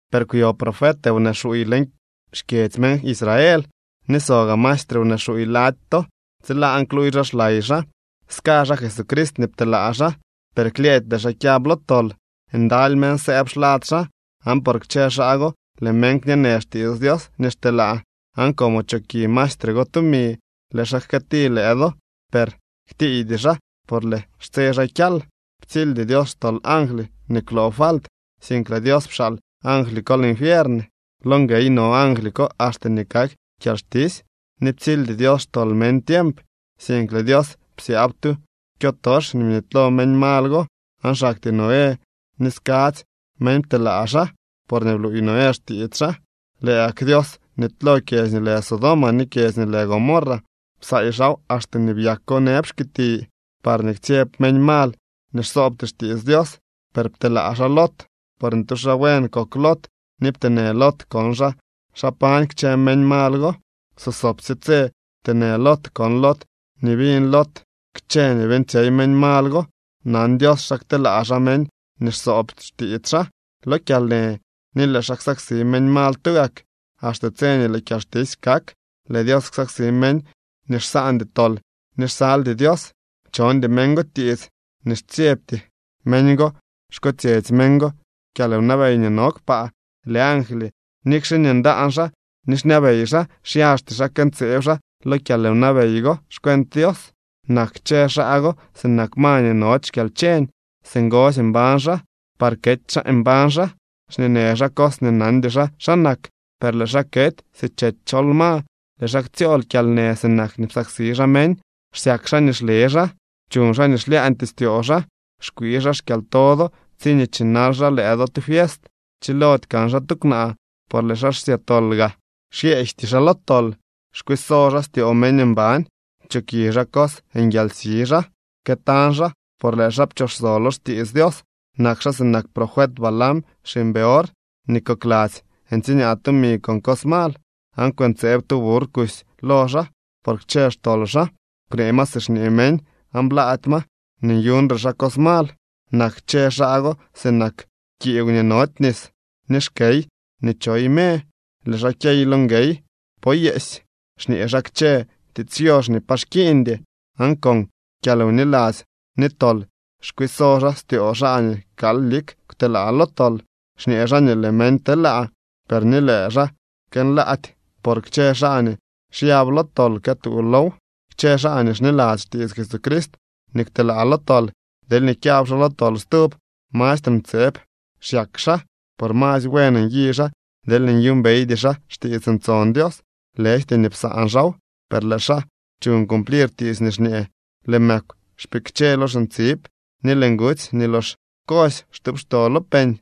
Per kwyo profet wnee xuuy leñ xkyedzy meñ Israel, ni so gaa maestre wnee xuuy lady to. Tsilaan kluuy xaa xlay xaa. Ska xaa Jesucrist nii pteelaa xaa, per klyëëdy lëë xaa kyab lo tol. Ndaly meñ sëëb xlad xaa, aan por kchë xaa go lëë meñ kñeenë xtiits Dios nii xteelaa. Aan como choki maestre go tumi, lëë xaa jkëëti lëë do, per ktiiydy xaa por lëë xtse xaa kyal. Ptsildy Dios xtol angly nii kwloo falt, sink lëë Dios pxaal angly ko linfiern. Lo nguey no angly ko axte nii kak kyalxtisy. Ni ptsildy Dios xtol meñ tiemp, sink lëë Dios psyaab tu kyotox nii bnitylo meñ mal go, aan xaktyee Noé ni skadzy meñ pteelaa xaa, porñee bluuy Noé xtiits xaa. Lëë gak Dios bnitylo kyedzy nii lë Sodoma ni kyedzy nii lë Gomorra. Psaay xaaw axte nii byako nëb xkiti, parñee ktsyeb meñ mal nii xsoobty xtiits Dios. Per pteelaa xaa Lot, porñee tu xaa buen kok Lot ni pteenë Lot kon xaa xa pañ kchë meñ mal go. Sosobsye tse pteenë Lot kon Lot ni biñ Lot kchë nii beeñtsyey meñ mal go. Nan Dios xa kteelaa xaa meñ nii xsoob xtiits xaa lo kyalnë ni lëë xaa ksaksi meñ mal tugak, axte tse nii lëë kyalxtisy kak. Lëë Dios ksaksi meñ nii xsaandy tol ni xsaldy Dios. Chondy meñ go tiits ni xtsyebty meñ go xkotsyetsy meñ go kyalwnabey nii no kpaa. Lëë angly, nikxe nii ndaan xaa ni xñabey xaa, xyaxty xaa këntseeb xaa lo kyalwnabey go xcuent Dios. Nak kchë xaa go sinak ma nii nody xkyalcheñ, singosy mbañ xaa, par kety xaa mbañ xaa. Xñeenë xaa cos nii nandy xaa xa nak, per lëë xaa kety si chety chol ma, lëë xaa ktsyool kyalnë sinak nii psaksi xaa meñ. Xsyak xaa nii xle xaa, chuñ xaa nii xlyaañtyee styoo xaa. Xkwii xaa xkyalto do tsiñee chinal xaa lëë do tu fiest. Chilody kan xaa tu kwnaa por lëë xaa xsya tol gaa, xyeejty xaa lo tol. Xkwiiso xaa styoo meñ mban, choki xaa cos, nguialsi xaa. Këtañ xaa por lëë xaa pchooxso lo xtiits Dios. Nak xaa sinak profet Balaam xiñ Beor, nii kokladzy ntsiñaa tumi con cos mal, aan kwëntseeb tu burr kusy lo xaa por kchë xtol xaa. Kwnee ma si xñee meñ aan blaady ma nii nyuñre xaa cos mal. Nak kchë xaa go sinak kiigw nii nody nis ni xkey nii choy me, lëë xaa kyey lo nguey poo yeesy. Xñee xaa kchë tiits yox nii pa xkiiñdy, aan con kyalwniladzy ni tol xkwiiso xaa styoo xaa nii kal lik kwtelaa lo tol. Xñee xaa nii lëë meñ telaa, per ni lëë xaa kënlaady, por kchë xaa nii xyab lo tol këtuu low. Kchë xaa nii xniladzy xtiits Jesucrist ni kwtelaa lo tol, deelñee kyab xaa lo tol stub, mastre ntseeb xyak xaa. Por masy buen nyi xaa deelñee nyuumbeydy xaa xtiits ntson Dios, lëjty nii psaan xaaw. Per lëë xaa chuñ cumplir tiits nii xñee: “Lëë mëkw xpikche lo xintsib, ni lëë ngutsy nii lox kosy xtuupxto lo peñ.”